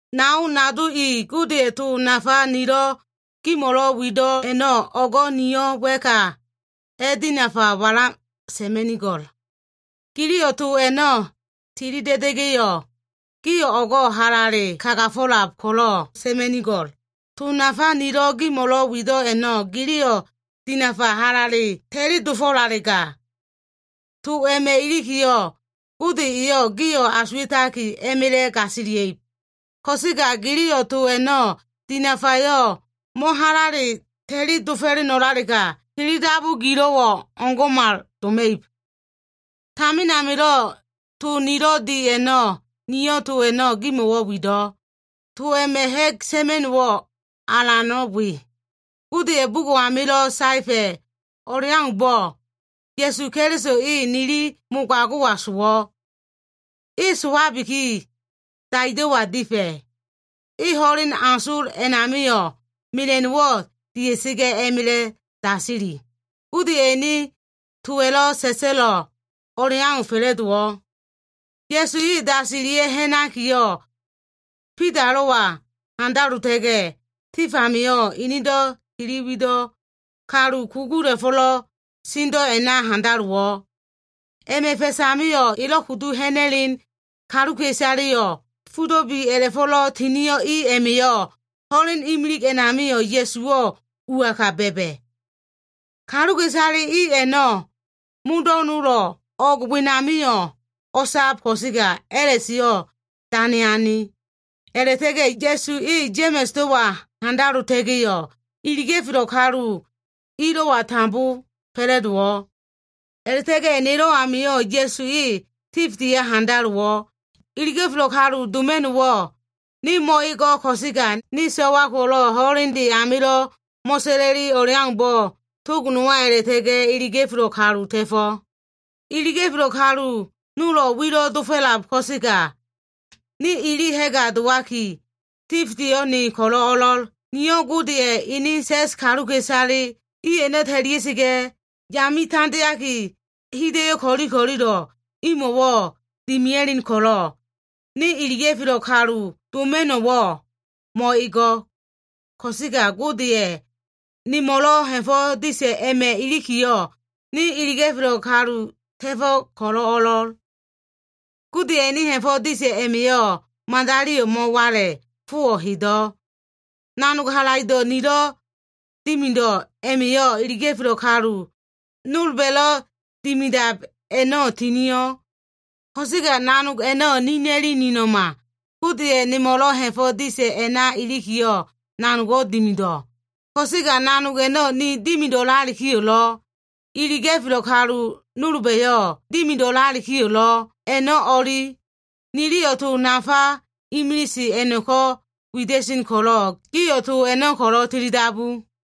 Nao nado i, Godeya꞉ to nafa nilo꞉ gimo꞉lo꞉ wido꞉ a꞉no꞉, o꞉go꞉ niyo꞉ wa꞉ka a꞉dinafa wala sa꞉ma꞉nigo꞉l. Giliyo꞉ to a꞉no꞉ tili da꞉da꞉ga꞉yo꞉, gio꞉ o꞉go꞉ halale kagafo꞉lab ko꞉lo꞉ sa꞉ma꞉nigo꞉l. To nafa nilo꞉ gimo꞉lo꞉ wido꞉ a꞉no꞉, giliyo꞉ dinafa halale ta꞉li dofo꞉lalega, to a꞉ma꞉ ilikiyo꞉, Gode eyo꞉ gio꞉ asuwa꞉taki a꞉ma꞉la꞉ gasilia꞉ib. Ko꞉sega giliyo꞉ to a꞉no꞉ dinafayo꞉ mo꞉halale ta꞉li dofo꞉leno꞉lalega, tilidabu gilo꞉wo꞉ o꞉ngo꞉mal doma꞉ib. Tamin amilo꞉ to nilo꞉ di a꞉no꞉, niyo꞉ to a꞉no꞉ gimo꞉ wido꞉. To a꞉ma꞉ ha꞉g sa꞉ma꞉no꞉ alano꞉ we, Godeya꞉ bugo꞉ amilo꞉ saefa꞉ o꞉leaumbo꞉, Ya꞉su Keliso e nili mogago꞉wa sowo꞉. E sowabiki, daido꞉wa difa꞉. E ho꞉len asol a꞉namio꞉, mela꞉no꞉wo꞉ dia꞉sa꞉ga꞉ a꞉ma꞉la꞉ dasili. Godeya꞉ ene towa꞉lo꞉ sa꞉sa꞉lo꞉ o꞉leau fa꞉la꞉dowo꞉. Ya꞉su e dasilia꞉ ha꞉nakiyo꞉, Bidalo꞉wa handalota꞉ga꞉yo꞉, tif amio꞉ enedo꞉ tili wido꞉ kalu kugula꞉fo꞉lo꞉ sendo꞉ a꞉na handalowo꞉. A꞉ma꞉ fa꞉s amio꞉ elo꞉ kudu ha꞉na꞉len kaluka꞉isaleyo꞉ fudo꞉ bi a꞉la꞉fo꞉lo꞉ tinio꞉ i a꞉ma꞉yo꞉ ho꞉len imilig a꞉namio꞉ Ya꞉suwo꞉ uaka ba꞉ba꞉. Kaluka꞉isale i a꞉no꞉, modo꞉ nolo꞉ o꞉g wenamio꞉ o꞉sab ko꞉sega a꞉la꞉seyo꞉ dane ane. A꞉la꞉ta꞉ga꞉ Ya꞉su e Ya꞉ma꞉sdowa handalota꞉ga꞉yo꞉, iliga꞉felo꞉ kalu ilo꞉wa tambo fa꞉la꞉dowo꞉. A꞉la꞉ta꞉ga꞉ nelo꞉ amio꞉ Ya꞉su e tifdeya handalowo꞉. Iliga꞉felo꞉ kalu doma꞉no꞉wo꞉ ne mo꞉ego꞉ ko꞉sega, ne so꞉wa ko꞉lo꞉ ho꞉lende amilo꞉ mo꞉sa꞉la꞉li o꞉leaumbo꞉, tog nowa a꞉la꞉ta꞉ga꞉ iliga꞉felo꞉ kalu ta꞉fo꞉. Iliga꞉felo꞉ kalu nolo꞉ wilo꞉ dofo꞉lab ko꞉sega, ne ili ha꞉ga dowaki, tifdeyo꞉ ne ko꞉lo꞉ o꞉lo꞉l. Niyo꞉ Godeya꞉ ene sa꞉s kaluka꞉isale i a꞉no꞉ ta꞉lia꞉sa꞉ga꞉, yame tandeaki, hida꞉yo꞉ ko꞉li ko꞉lilo꞉ imo꞉wo꞉ dimia꞉len ko꞉lo꞉, ne iliga꞉felo꞉ kalu doma꞉no꞉wo꞉ mo꞉ego꞉. Ko꞉sega Godeya꞉ nemo꞉lo꞉ ha꞉fo꞉ disa꞉ a꞉ma꞉ ilikiyo꞉, ne iliga꞉felo꞉ kalu ta꞉fo꞉ ko꞉lo꞉ o꞉lo꞉l. Godeya꞉ ene ha꞉fo꞉ disa꞉ a꞉ma꞉yo꞉ madaliyo꞉ mo꞉wala꞉, fowo꞉ hedo꞉. Nanog halaido꞉ nilo꞉ dimido꞉ a꞉ma꞉yo꞉, iliga꞉felo꞉ kalu nolba꞉lo꞉ dimidab a꞉no꞉ tinio꞉. Ko꞉sega nanog a꞉no꞉ nina꞉li nino꞉ma. Godeya꞉ nemo꞉lo꞉ ha꞉fo꞉ disa꞉ a꞉na ilikiyo꞉, nanogo꞉ dimido꞉. Ko꞉sega nanog a꞉no꞉ ni dimido꞉lalikiyo꞉lo꞉, iliga꞉felo꞉ kalu nolba꞉yo꞉ dimido꞉lalikiyo꞉lo꞉, a꞉no꞉ o꞉li. Niliyo꞉ to nafa imilise a꞉no꞉ko꞉ wida꞉sen ko꞉lo꞉, gio꞉ to a꞉no꞉ ko꞉lo꞉ tilidabu.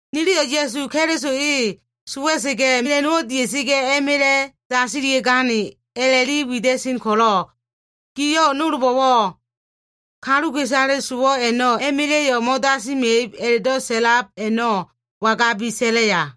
Niliyo꞉ Ya꞉su Keliso e sowa꞉sa꞉ga꞉ mela꞉no꞉wo꞉ dia꞉sa꞉ga꞉, a꞉ma꞉la꞉ dasilia꞉gane a꞉la꞉li wida꞉sen ko꞉lo꞉, gio꞉ nolba꞉yo꞉ “Kaluka꞉isale sowo꞉ a꞉no꞉ a꞉ma꞉la꞉yo꞉ mo꞉dasima꞉ib” a꞉la꞉do꞉ sa꞉lab a꞉no꞉ wangabi sa꞉laya?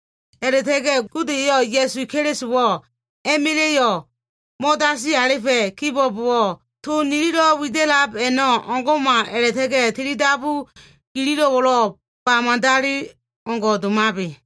A꞉la꞉ta꞉ga꞉ Gode eyo꞉ Ya꞉su Kelisowo꞉ a꞉ma꞉la꞉yo꞉ mo꞉dasili alifa꞉ kibo꞉bowo꞉, to nililo꞉ wida꞉lab a꞉no꞉ o꞉ngo꞉mal a꞉la꞉ta꞉ga꞉ tili dabu gilo꞉wo꞉lo꞉ ba madali o꞉ngo꞉ domabe.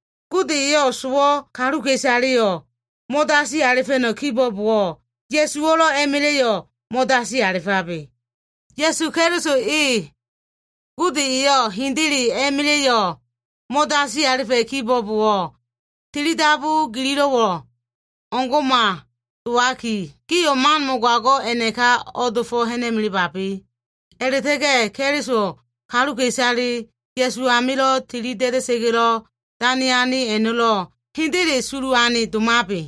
Gode eyo꞉ sowo꞉ kaluka꞉isaleyo꞉ mo꞉dasi alifa꞉no꞉ kibo꞉bowo꞉, Ya꞉suwo꞉lo꞉ a꞉ma꞉la꞉yo꞉ mo꞉dasi alifabe. Ya꞉su Keliso e Gode eyo꞉ hendele a꞉ma꞉la꞉yo꞉ mo꞉dasi alifa꞉ kibo꞉bowo꞉, tili dabu gililo꞉wo꞉ o꞉ngo꞉mal dowaki, gio꞉ man mogago꞉ a꞉naka o꞉dofo꞉ ha꞉na꞉melebabe. A꞉la꞉ta꞉ga꞉ Keliso kaluka꞉isale Ya꞉su amilo꞉ tili da꞉da꞉sa꞉ga꞉lo꞉ dane ane a꞉no꞉lo꞉ hendele sulu ane domabe.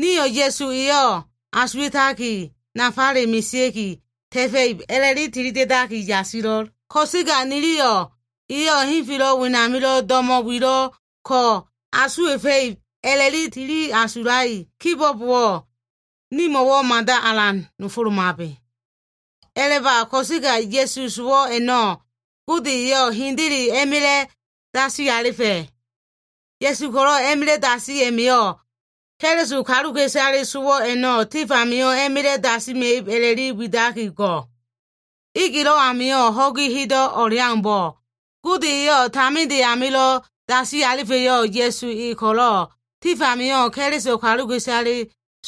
Nio꞉ Ya꞉su eyo꞉ asuwa꞉taki, nafale mesea꞉ki ta꞉fa꞉ib a꞉la꞉li tilida꞉daki yasilo꞉l. Ko꞉sega niliyo꞉ eyo꞉ henfelo꞉ wenamilo꞉ do꞉mo꞉ wilo꞉ ko asuwa꞉fa꞉ib a꞉la꞉li tili asulai kibo꞉bowo꞉, nimo꞉wo꞉ mada alan nofolomabe. A꞉laba. Ko꞉sega Ya꞉su sowo꞉ a꞉no꞉ Gode eyo꞉ hendele a꞉ma꞉la꞉ dasi alifa꞉. Ya꞉su ko꞉lo꞉ a꞉ma꞉la꞉ dasi a꞉ma꞉yo꞉, Keliso kaluka꞉isale sowo꞉ a꞉no꞉ tif amio꞉ a꞉ma꞉la꞉ dasima꞉ib a꞉la꞉li widaki go꞉. Egelo꞉ amilo꞉ ho꞉gi hedo꞉ o꞉leaumbo꞉, Gode eyo꞉ taminde amilo꞉ dasi alifa꞉yo꞉ Ya꞉su e ko꞉lo꞉, tif amio꞉ Keliso kaluka꞉isale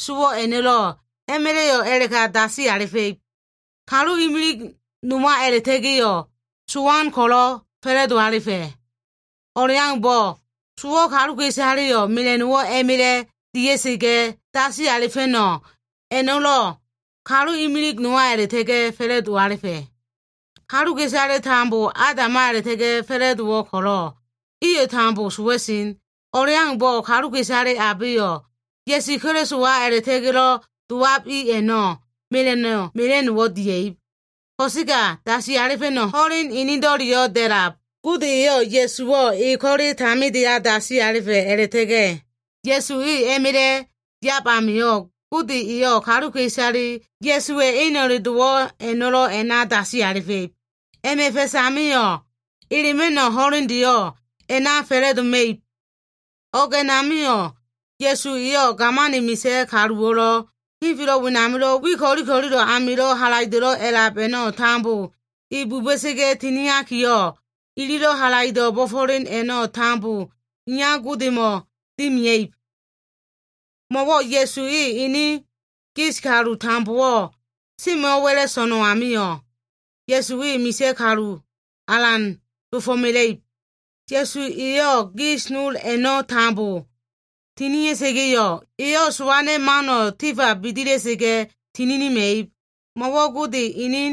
sowo꞉ a꞉no꞉lo꞉ a꞉ma꞉la꞉yo꞉ a꞉la꞉ka dasi alifa꞉ib. Kalu imilig nowa a꞉la꞉ta꞉ga꞉yo꞉ sowano꞉ ko꞉lo꞉ fa꞉la꞉do alifa꞉. O꞉leaumbo꞉, sowo꞉ kaluka꞉isaleyo꞉ mela꞉no꞉wo꞉ a꞉ma꞉la꞉ dia꞉sa꞉ga꞉ dasi alifa꞉no꞉ a꞉no꞉lo꞉, kalu imilig nowa a꞉la꞉ta꞉ga꞉ fa꞉la꞉do alifa꞉. Kaluka꞉isaleyo꞉ tambo Adama a꞉la꞉ta꞉ga꞉ fa꞉la꞉dowo꞉ ko꞉lo꞉, iyo꞉ tambo sowa꞉lab. O꞉leaumbo꞉ kaluka꞉isale abeyo꞉ Ya꞉su Kelisowa amilo꞉ dowab i a꞉no꞉ mela꞉no꞉ mela꞉no꞉wo꞉ dia꞉ib. Ko꞉sega dasi alifa꞉no꞉ ho꞉len enedo꞉leyo꞉ da꞉lab. Gode eyo꞉ Ya꞉suwo꞉ e ko꞉le tamindeya dasi alifa꞉ a꞉la꞉ta꞉ga꞉, Ya꞉su e a꞉ma꞉la꞉ yab amio꞉, Gode eyo꞉ kaluka꞉isale Ya꞉suwa꞉ eno꞉le dowo꞉ a꞉no꞉lo꞉ a꞉na dasi alifa꞉ib. A꞉ma꞉ fa꞉s amio꞉, elema꞉no꞉ ho꞉lendeyo꞉ a꞉na fa꞉la꞉doma꞉ib. O꞉g a꞉namio꞉, Ya꞉su eyo꞉ gamani misa꞉ kaluwo꞉lo꞉, henfelo꞉ wenamilo꞉ wi ko꞉li ko꞉lilo꞉ amilo꞉ halaido꞉lo꞉ a꞉lab a꞉no꞉ tambo, e buba꞉sa꞉ga꞉ tiniakiyo꞉, ililo꞉ halaido꞉ bo꞉fo꞉len a꞉no꞉ tambo iya Godemo꞉ dimia꞉ib. Mo꞉wo꞉ Ya꞉su e ene gis kalu tambowo꞉ semo꞉ wa꞉la꞉ so꞉no꞉ amio꞉, Ya꞉su e misa꞉ kalu alan dofo꞉mela꞉ib. Ya꞉su eyo꞉ gis nol a꞉no꞉ tambo tinia꞉sa꞉ga꞉yo꞉, eyo꞉ sowan mano꞉ tifa bidila꞉sa꞉ga꞉ tininima꞉ib. Mo꞉wo꞉ Gode ene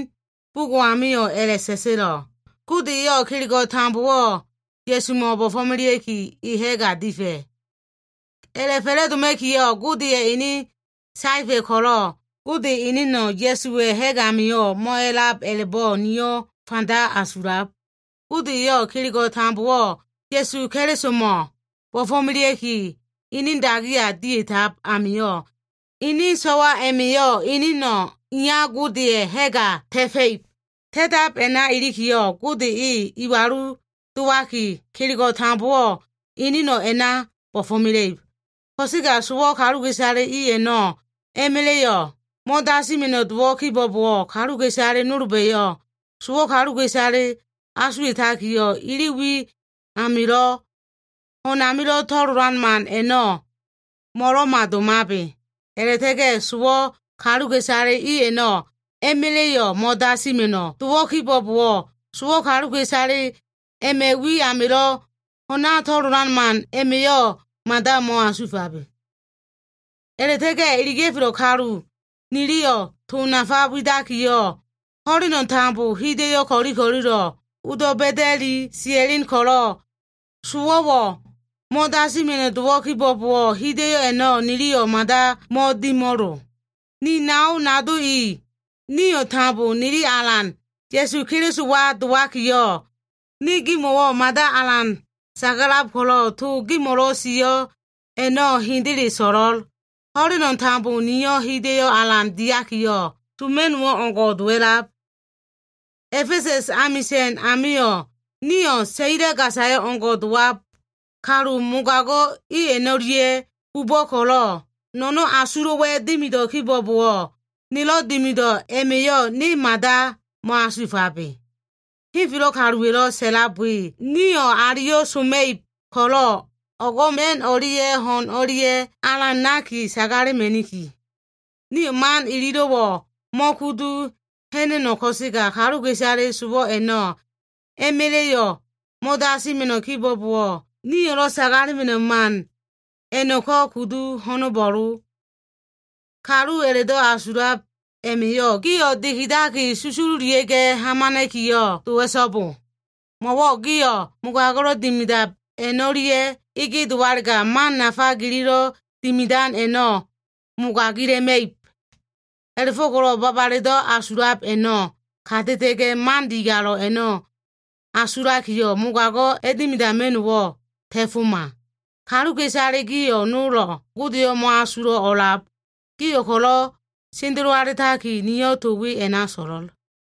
bugo꞉ amio꞉ a꞉la꞉sa꞉sa꞉lo꞉, “Gode eyo꞉ kelego꞉ tambowo꞉ Ya꞉sumo꞉ bo꞉fo꞉melea꞉ki, e ha꞉ga difa꞉.” A꞉la꞉fa꞉la꞉doma꞉kiyo꞉ Godeya꞉ ene saefa꞉ ko꞉lo꞉, Gode eneno꞉ Ya꞉suwa꞉ ha꞉g amio꞉ mo꞉a꞉lab a꞉la꞉bo꞉ nio꞉ fanda asulab. Gode eyo꞉ kelego꞉ tambowo꞉ Ya꞉su Kelisomo꞉ bo꞉fo꞉melea꞉ki ene dagiya dia꞉tab amio꞉, ene so꞉wa a꞉ma꞉yo꞉ eneno꞉ iya Godeya꞉ ha꞉ga ta꞉fa꞉ib. Ta꞉tab a꞉na ilikiyo꞉, Gode e iwalu dowaki, kelego꞉ tambowo꞉ eneno꞉ a꞉na bo꞉fo꞉mela꞉ib. Ko꞉sega sowo꞉ kaluka꞉isale i a꞉no꞉ a꞉ma꞉la꞉yo꞉ mo꞉dasima꞉no꞉ dowo꞉ kibo꞉bowo꞉, kaluka꞉isale nolba꞉yo꞉ sowo꞉ kaluka꞉isale asuwa꞉takiyo꞉, ili wi amilo꞉ ho꞉n amilo꞉ to꞉lolan man a꞉no꞉ mo꞉lo꞉ma domabe. A꞉la꞉ta꞉ga꞉ sowo꞉ kaluka꞉isale i a꞉no꞉ a꞉ma꞉la꞉yo꞉ mo꞉dasima꞉no꞉ dowo꞉ kibo꞉bowo꞉, sowo꞉ kaluka꞉isale a꞉ma꞉ wi amilo꞉ ho꞉na to꞉lolan man a꞉ma꞉yo꞉ mada mo꞉asuwa꞉fabe. A꞉la꞉ta꞉ga꞉ iliga꞉felo꞉ kalu niliyo꞉ to nafa widakiyo꞉, ho꞉leno꞉ tambo hida꞉yo꞉ ko꞉li ko꞉lilo꞉ odo꞉ ba꞉da꞉li sia꞉len ko꞉lo꞉, sowo꞉wo꞉ mo꞉dasima꞉no꞉ dowo꞉ kibo꞉bowo꞉, hida꞉yo꞉ a꞉no꞉ niliyo꞉ mada mo꞉dimo꞉lo. Ni nao nado i, nio꞉ tambo nili Alan Ya꞉su Kelisowa dowakiyo꞉, ne gimo꞉wo꞉ mada alan sagalab ko꞉lo꞉, to gimo꞉lo꞉ sio꞉ a꞉no꞉ hendele so꞉lo꞉l. Ho꞉leno꞉ tambo niyo꞉ hida꞉yo꞉ alan diakiyo꞉ soma꞉no꞉wo꞉ o꞉ngo꞉ dowa꞉lab. A꞉fesa꞉s amisa꞉n amio꞉, niyo꞉ saila gasa o꞉ngo꞉ dowab kalu mogago꞉ i a꞉no꞉lia꞉ bubo꞉ ko꞉lo꞉, no꞉no꞉n asulo꞉wa꞉ dimido꞉ kibo꞉bowo꞉, nilo꞉ dimido꞉ a꞉ma꞉yo꞉ ne mada mo꞉asuwa꞉fabe. Henfelo꞉ kaluwa꞉lo꞉ sa꞉lab we, “Nio꞉ aliyo꞉ soma꞉ib ko꞉lo꞉, o꞉go꞉ ma꞉n o꞉lia꞉ ho꞉n o꞉lia꞉ alan naki sagalema꞉niki.” Nio꞉ man ililo꞉wo꞉ mo꞉kudu ha꞉na꞉no꞉ ko꞉sega, kaluka꞉isale sowo꞉ a꞉no꞉ a꞉ma꞉la꞉yo꞉ mo꞉dasima꞉no꞉ kibo꞉bowo꞉, nio꞉lo꞉ sagalema꞉no꞉ man a꞉no꞉ko꞉ kudu ho꞉no꞉bo꞉lo. Kalu a꞉la꞉do꞉ asulab a꞉ma꞉yo꞉ gio꞉ dikidaki susululia꞉ga꞉ hamana꞉kiyo꞉ dowa꞉so꞉bo. Mo꞉wo꞉ gio꞉ mogago꞉lo꞉ dimidab a꞉no꞉lia꞉ ege dowalega, man nafa gililo꞉ dimidan a꞉no꞉ mogagila꞉ma꞉ib. A꞉la꞉fo꞉ko꞉lo꞉ babaledo꞉ asulab a꞉no꞉ kata꞉ta꞉ga꞉, man digalo꞉le a꞉no꞉ asulakiyo꞉, mogago꞉ a꞉dimidama꞉no꞉wo꞉ ta꞉foma. Kaluka꞉isale gio꞉ nolo꞉ Godeyo꞉ mo꞉asulo꞉ o꞉lab. Gio꞉ ko꞉lo꞉ sendelo alitaki, niyo꞉ to we a꞉na so꞉lo꞉l.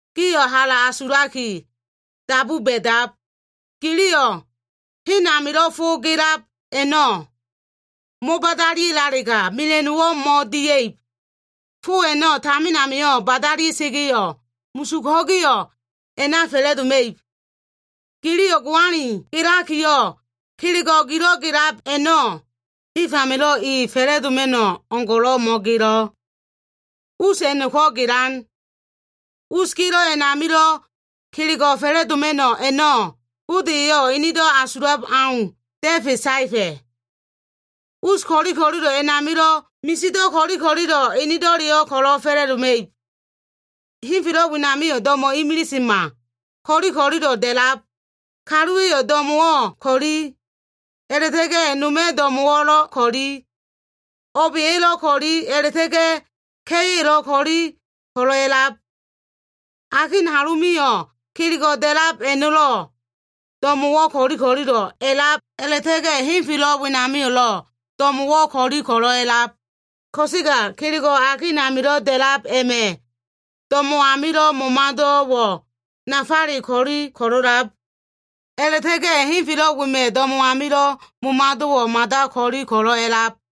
Gio꞉ hala asulaki dabu ba꞉dab. Giliyo꞉ hen amilo꞉ fo gelab a꞉no꞉ mo꞉badalialega, mela꞉no꞉lo꞉ mo꞉dia꞉ib. Fo a꞉no꞉ tamin amio꞉ badalia꞉sa꞉ga꞉yo꞉, musug ho꞉giyo꞉ a꞉na fa꞉la꞉doma꞉ib. Giliyo꞉ goani gelakiyo꞉, kelego꞉ gilo꞉ gelab a꞉no꞉, tif amilo꞉ i fa꞉la꞉doma꞉no꞉ o꞉ngo꞉lo꞉ mo꞉gelo꞉. Us a꞉no꞉ko꞉ gelan. Us gelo꞉ amilo꞉ kelego꞉ fa꞉la꞉doma꞉no꞉ a꞉no꞉ Gode eyo꞉ enedo꞉ asulab au da꞉fe saefa꞉. Us ko꞉li ko꞉lilo꞉ a꞉namio꞉, misido꞉ ko꞉li ko꞉lilo꞉ enedo꞉leyo꞉ ko꞉lo꞉ fa꞉la꞉doma꞉ib. Henfelo꞉ wenamio꞉ do꞉mo꞉wo꞉ imilisema, ko꞉li ko꞉lilo꞉ da꞉lab. Kaluwa꞉ do꞉mo꞉wo꞉ ko꞉li, a꞉la꞉ta꞉ga꞉ no꞉ma꞉ do꞉mo꞉wo꞉lo꞉ ko꞉li. O꞉ba꞉yo꞉lo꞉ ko꞉li, a꞉la꞉ta꞉ga꞉ ka꞉yo꞉lo꞉ ko꞉li ko꞉lo꞉ a꞉lab. Akin halonamio꞉ kelego꞉ da꞉lab a꞉no꞉lo꞉ do꞉mo꞉wo꞉ ko꞉li ko꞉lilo꞉ a꞉lab, a꞉la꞉ta꞉ga꞉ henfelo꞉ wenamio꞉lo꞉ do꞉mo꞉wo꞉ ko꞉li ko꞉lo꞉ a꞉lab. Ko꞉sega kelego꞉ akin amilo꞉ da꞉lab a꞉ma꞉ do꞉mo꞉ amilo꞉ momado꞉wo꞉ nafale ko꞉li ko꞉lo꞉lab. A꞉la꞉ta꞉ga꞉ henfelo꞉ wema꞉ do꞉mo꞉ amilo꞉ momado꞉wo꞉ mada ko꞉li ko꞉lo꞉ a꞉lab.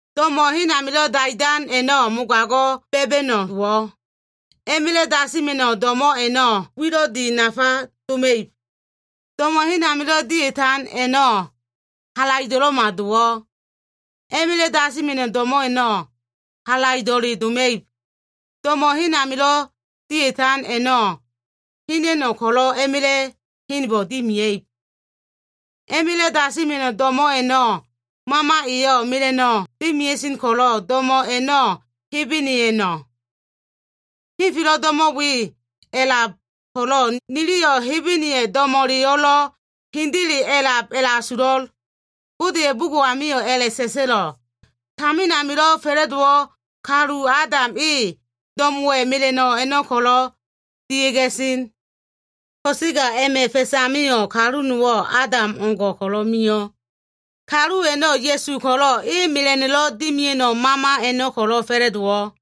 Do꞉mo꞉ hen amilo꞉ dia꞉tan a꞉no꞉, mogago꞉ ba꞉ba꞉no꞉ dowo꞉. A꞉ma꞉la꞉ dasima꞉no꞉ do꞉mo꞉ a꞉no꞉, wilo꞉ di nafale doma꞉ib. Do꞉mo꞉ hen amilo꞉ dia꞉tan a꞉no꞉, halaido꞉lo꞉ma dowo꞉. A꞉ma꞉la꞉ dasima꞉no꞉ do꞉mo꞉ a꞉no꞉, halaido꞉le doma꞉ib. Do꞉mo꞉ hen amilo꞉ dia꞉tan a꞉no꞉, hena꞉no꞉ ko꞉lo꞉ a꞉ma꞉la꞉ henbo꞉ dimiab. A꞉ma꞉la꞉ dasima꞉no꞉ do꞉mo꞉ a꞉no꞉, mama eyo꞉ mela꞉no꞉ dimia꞉sen ko꞉lo꞉ do꞉mo꞉ a꞉no꞉ Hebene eno꞉. Henfelo꞉ do꞉mo꞉ we a꞉lab ko꞉lo꞉, niliyo꞉ Hebeneya꞉ do꞉mo꞉leyo꞉lo꞉ hendele a꞉lab a꞉la꞉asulo꞉. Godeya꞉ bugo꞉ amio꞉ a꞉la꞉sa꞉sa꞉lo꞉, “Tamin amilo꞉ fa꞉la꞉dowo꞉ kalu Adam e do꞉mo꞉wa꞉ mela꞉no꞉ a꞉no꞉ ko꞉lo꞉ dia꞉ga꞉ sen.” Ko꞉sega a꞉ma꞉ fa꞉s amio꞉ kalu nowo꞉ Adam o꞉ngo꞉ ko꞉lo꞉ mio꞉. Kalu a꞉no꞉ Ya꞉su ko꞉lo꞉, e mela꞉no꞉lo꞉ dimia꞉no꞉ mama a꞉no꞉ ko꞉lo꞉ fa꞉la꞉dowo꞉.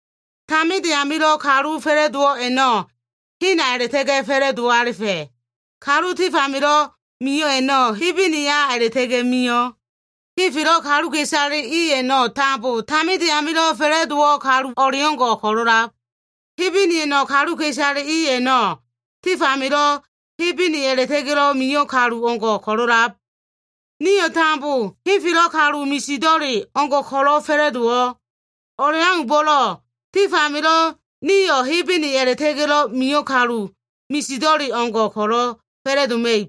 Taminde amilo꞉ kalu fa꞉la꞉dowo꞉ a꞉no꞉ hena a꞉la꞉ta꞉ga꞉ fa꞉la꞉do alifa꞉. Kalu tif amilo꞉ mio꞉ a꞉no꞉ Hebene a꞉la꞉ta꞉ga꞉ mio꞉. Henfelo꞉ kaluka꞉isale i a꞉no꞉ tambo, taminde amilo꞉ fa꞉la꞉dowo꞉ kalu o꞉leo꞉ngo꞉ ko꞉lo꞉lab. Hebeneya꞉no꞉ kaluka꞉isale i a꞉no꞉, tif amilo꞉ Hebene a꞉la꞉ta꞉ga꞉lo꞉ mio꞉ kalu o꞉ngo꞉ ko꞉lo꞉lab. Nio꞉ tambo henfelo꞉ kalu misido꞉le o꞉ngo꞉ ko꞉lo꞉ fa꞉la꞉dowo꞉. O꞉leaumbo꞉lo꞉, tif amio꞉ nio꞉ Hebene a꞉la꞉ta꞉ga꞉lo꞉ mio꞉ kalu misido꞉le o꞉ngo꞉ ko꞉lo꞉ fa꞉la꞉doma꞉ib.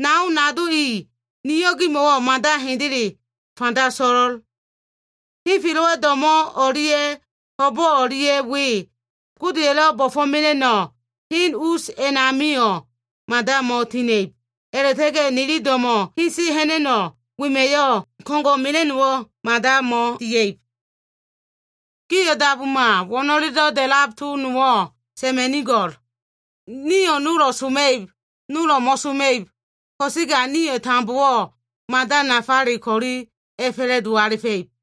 Nao nado i, niyo꞉ gimo꞉wo꞉ mada hendele fanda so꞉lo꞉l. Henfelo꞉wa꞉ do꞉mo꞉ o꞉lia꞉ ho꞉bo꞉ o꞉lia꞉ we, Godeya꞉lo꞉ bo꞉fo꞉mela꞉no꞉ hen us a꞉namio꞉ mada mo꞉tina꞉ib. A꞉la꞉ta꞉ga꞉ nili do꞉mo꞉ hese ha꞉na꞉no꞉ wema꞉yo꞉, ko꞉ngo꞉ mela꞉no꞉wo꞉ mada mo꞉dia꞉ib. Gio꞉ dabuma. To wo꞉no꞉lelo꞉ da꞉lab nowo꞉ sa꞉ma꞉nigo꞉l. Nio꞉ nolo꞉ soma꞉ib, nolo꞉ mo꞉soma꞉ib, ko꞉sega Gode eyo꞉ nio꞉ tambo mada nafale ko꞉li a꞉fa꞉la꞉do alifa꞉ib.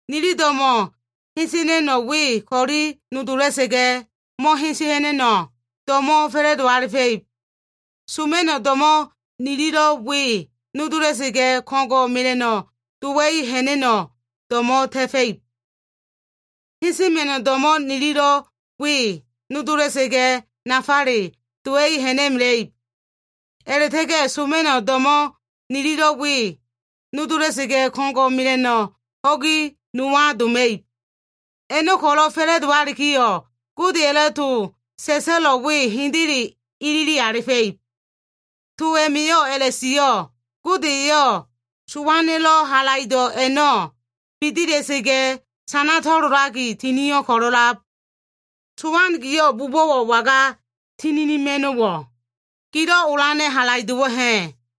Nili do꞉mo꞉ hese ha꞉na꞉no꞉ we ko꞉li nodola꞉sa꞉ga꞉, mo꞉hese ha꞉na꞉no꞉ do꞉mo꞉ fa꞉la꞉doma꞉ib. Soma꞉no꞉ do꞉mo꞉ nililo꞉ we nodola꞉sa꞉ga꞉, ko꞉ngo꞉ mela꞉no꞉ dowa꞉i ha꞉na꞉no꞉ do꞉mo꞉ ta꞉fa꞉ib. Hesema꞉no꞉ do꞉mo꞉ nililo꞉ we nodola꞉sa꞉ga꞉, nafale dowa꞉i ha꞉na꞉mela꞉ib. A꞉la꞉ta꞉ga꞉ soma꞉no꞉ do꞉mo꞉ nililo꞉ we nodola꞉sa꞉ga꞉, ko꞉ngo꞉ mela꞉no꞉ ho꞉gi nowa doma꞉ib. A꞉no꞉ ko꞉lo꞉ fa꞉la꞉dowalikiyo꞉, Godeya꞉lo꞉ to sa꞉sa꞉lo꞉ we hendele ilili alifa꞉ib. To a꞉ma꞉yo꞉ a꞉la꞉sio꞉, “Gode eyo꞉ sowana꞉lo꞉ halaido꞉ a꞉no꞉ bidila꞉sa꞉ga꞉, sana to꞉lolaki tinio꞉ ko꞉lo꞉lab.” “Sowan, giyo꞉ bubo꞉wo꞉ waga tininima꞉no꞉wo꞉? Gilo꞉ olana꞉ halaido꞉wo꞉ ha꞉?”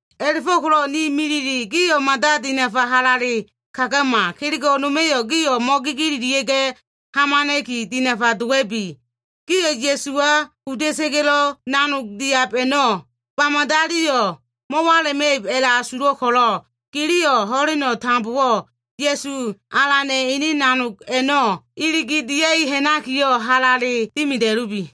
A꞉la꞉fo꞉ko꞉lo꞉ ni milile, tilidabu ginido꞉ amio꞉ mada dinafa halale kagama. Man ko꞉li ko꞉lilo꞉ a꞉ma꞉yo꞉ gio꞉ kanilia꞉ga꞉ ha꞉nabena꞉ki dinafa dowa꞉bi. Gio꞉ Ya꞉suwa kuda꞉sa꞉ga꞉lo꞉ nanog diab a꞉no꞉, ba madaliyo꞉ mo꞉wala꞉ma꞉ib a꞉la꞉asulo꞉ ko꞉lo꞉, giliyo꞉ ho꞉leno꞉ tambowo꞉ Ya꞉su Alana꞉ ene nanog a꞉no꞉ iligi dia꞉i ha꞉nakiyo꞉ halale dimida꞉lubi.